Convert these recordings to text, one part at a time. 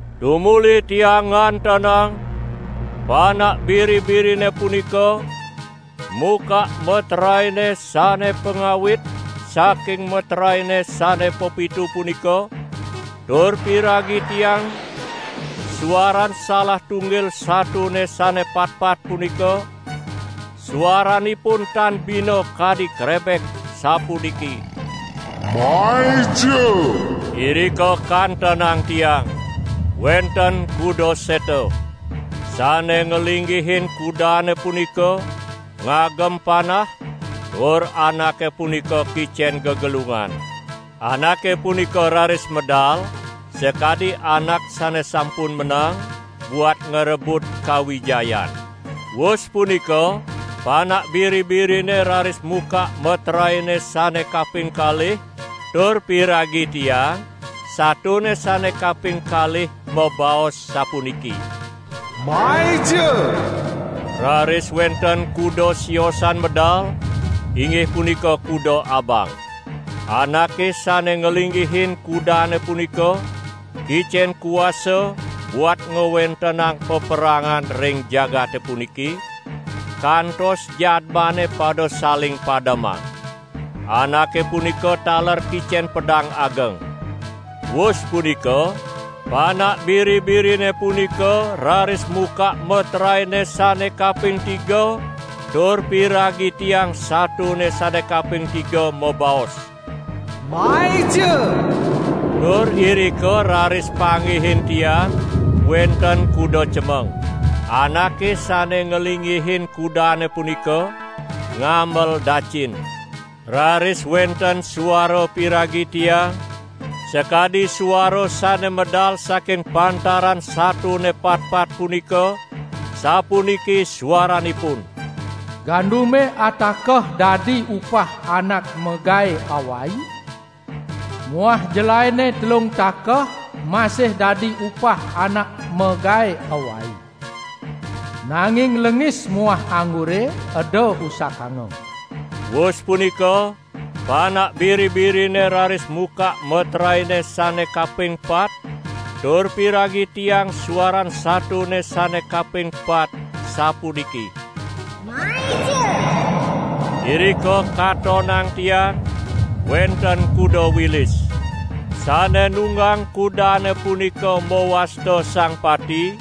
Tumuli tiang ngatonang Panak Biri-birine punika mukak meteraene sane pangawit saking meteraene sane pepitu punika, tur piragi tiang suaran salah tunggil satone sane patpat punika, suaranipun tan bina kadi krebek sapuniki: "Maija!" Irika kantenang tiang wenten kuda seta. Sane nglinggihin kudane punika ngagem panah, tur anake punika kicen gegelungan. Anake punika raris medal sakadi anak sane sampun menang buat ngrebut kawijayan. Wus punika Panak Biri-birine raris mukak meteraene sane kaping kalih, tur piragi tiang satone sane kaping kalih mabaos sapuniki: "Maija!" Raris wenten kuda siosan medal, inggih punika kuda abang. Anake sane nglinggihin kudane punika kicen kuasa buat ngwentenang paperangan ring jagate puniki, kantos jadmane pada saling pademang. Anake punika taler kicen pedang ageng. Wus punika Panak Biri-birine punika raris mukak meteraene sane kaping tiga; tur piragi tiang satone sane kaping tiga mabaos: "Maija!" Tur irika raris panggihin tiang wenten kuda cemeng. Anake sane nglinggihin kudane punika, ngamel dacin. Raris wenten suara piragi tiang sakadi suara sane medal saking pantaran satone patpat punika, sapuniki suaranipun: "Gandume atakeh dadi upah anak magae awai muah jelaene telung takeh masih dadi upah anak magae awai. Nanging lengis muah anggure eda usakanga!" Wus punika Panak Biri-birine raris mukak meteraene sane kaping pat tur piragi tiang suaran satone sane kaping pat sapuniki: "Maija!" Irika katonang tiang wenten kuda wilis. Sane nunggang kudane punika mawasta Sang Pati,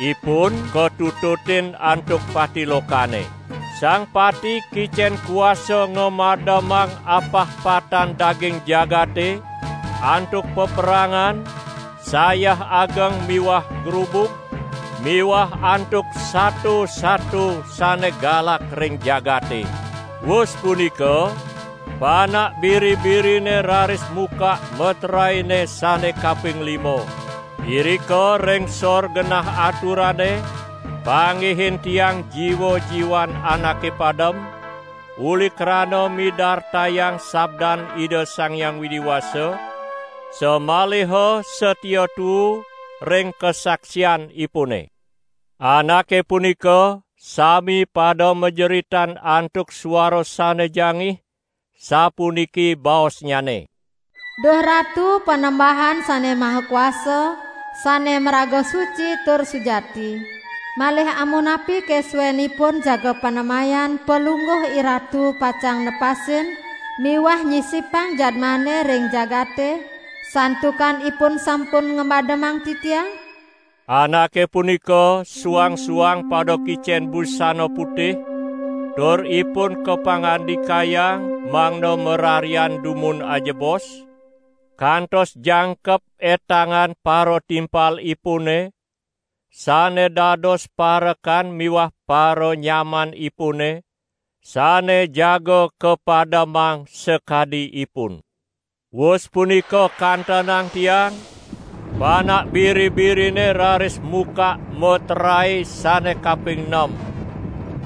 ipun katututin antuk Pati Lokane. Sang Pati kicen kuasa ngamademang apah patan daging jagate, antuk paperangan, sayah ageng miwah grubug miwah antuk sato-sato sane galak ring jagate. Wus punika Panak Biri-birine raris mukak meteraene sane kaping lima. Irika ring sor genah aturane panggihin tiang jiwa-jiwan anake padem uli krana midartayang sabdan Ida Sang Hyang Widi Wasa, samaliha satia tuu ring kasaksianipune. Anake punika sami pada majeritan antuk suara sane jangih, sapuniki baosnyane: "Duh Ratu Panembahan Sane Maha Kuasa, sane maraga suci tur sujati. Malih amunapike suenipun jaga panemayan Palungguh IRatu pacang nepasin miwah nyisipang jadmane ring jagate, santukan ipun sampun ngamademang titiang?" Anake punika suang-suang pada kicen busana putih, tur ipun kapangandikayang mangda mararian dumun ajebos, kantos jangkep etangan paratimpalipune sane dados parekan miwah paranyamanipune sane jaga kapademang sakadi ipun. Wus punika kantenang tiang Panak Biri-birine raris mukak meterae sane kaping nem.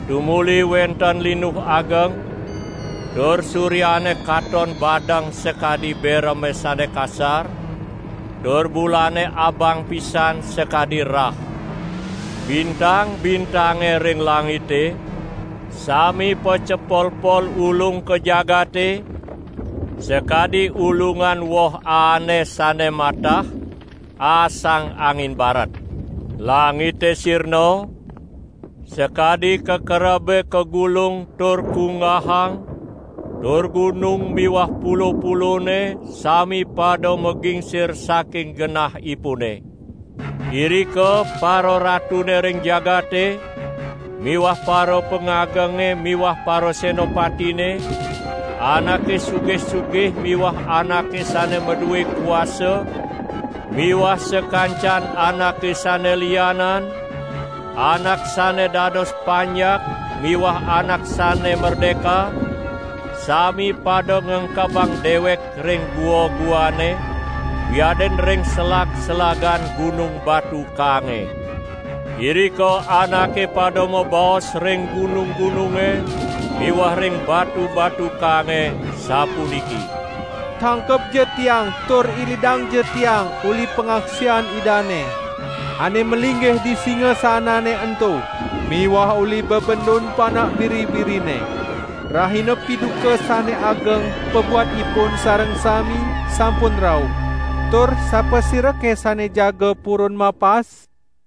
Tumuli wenten linuh ageng tur suryane katon badeng sakadi bereme sane kasar, tur bulane abang pisan sakadi rah. Bintang-bintange ring langite sami pacepolpol ulung ka jagate sakadi ulungan woh aane sane matah aasang angin baret. Langite sirna sakadi kakerebe kagulung tur kunggahang, tur gunung miwah pulo-pulone sami pada magingsir saking genahipune. Irika pararatune ring jagate miwah parapangagenge miwah parasenapatine, anake sugih-sugih miwah anake sane madue kuasa miwah sakancan anake sane lianan, anak sane dados panjak miwah anak sane merdeka, sami pada ngengkebang dewek ring gua-guane wiadin ring selag-selagan gunung batu kaange. Irika anake pada mabaos ring gunung-gununge miwah ring batu-batu kaange sapuniki: "Tangkebja tiang tur ilidangja tiang uli pangaksian Idane, ane malinggih di singasanane ento miwah uli bebendun Panak Biri-birine. Rahina piduka sane ageng pabuat ipun sareng sami sampun rauh, tur sapasirake sane jaga purun mapas?"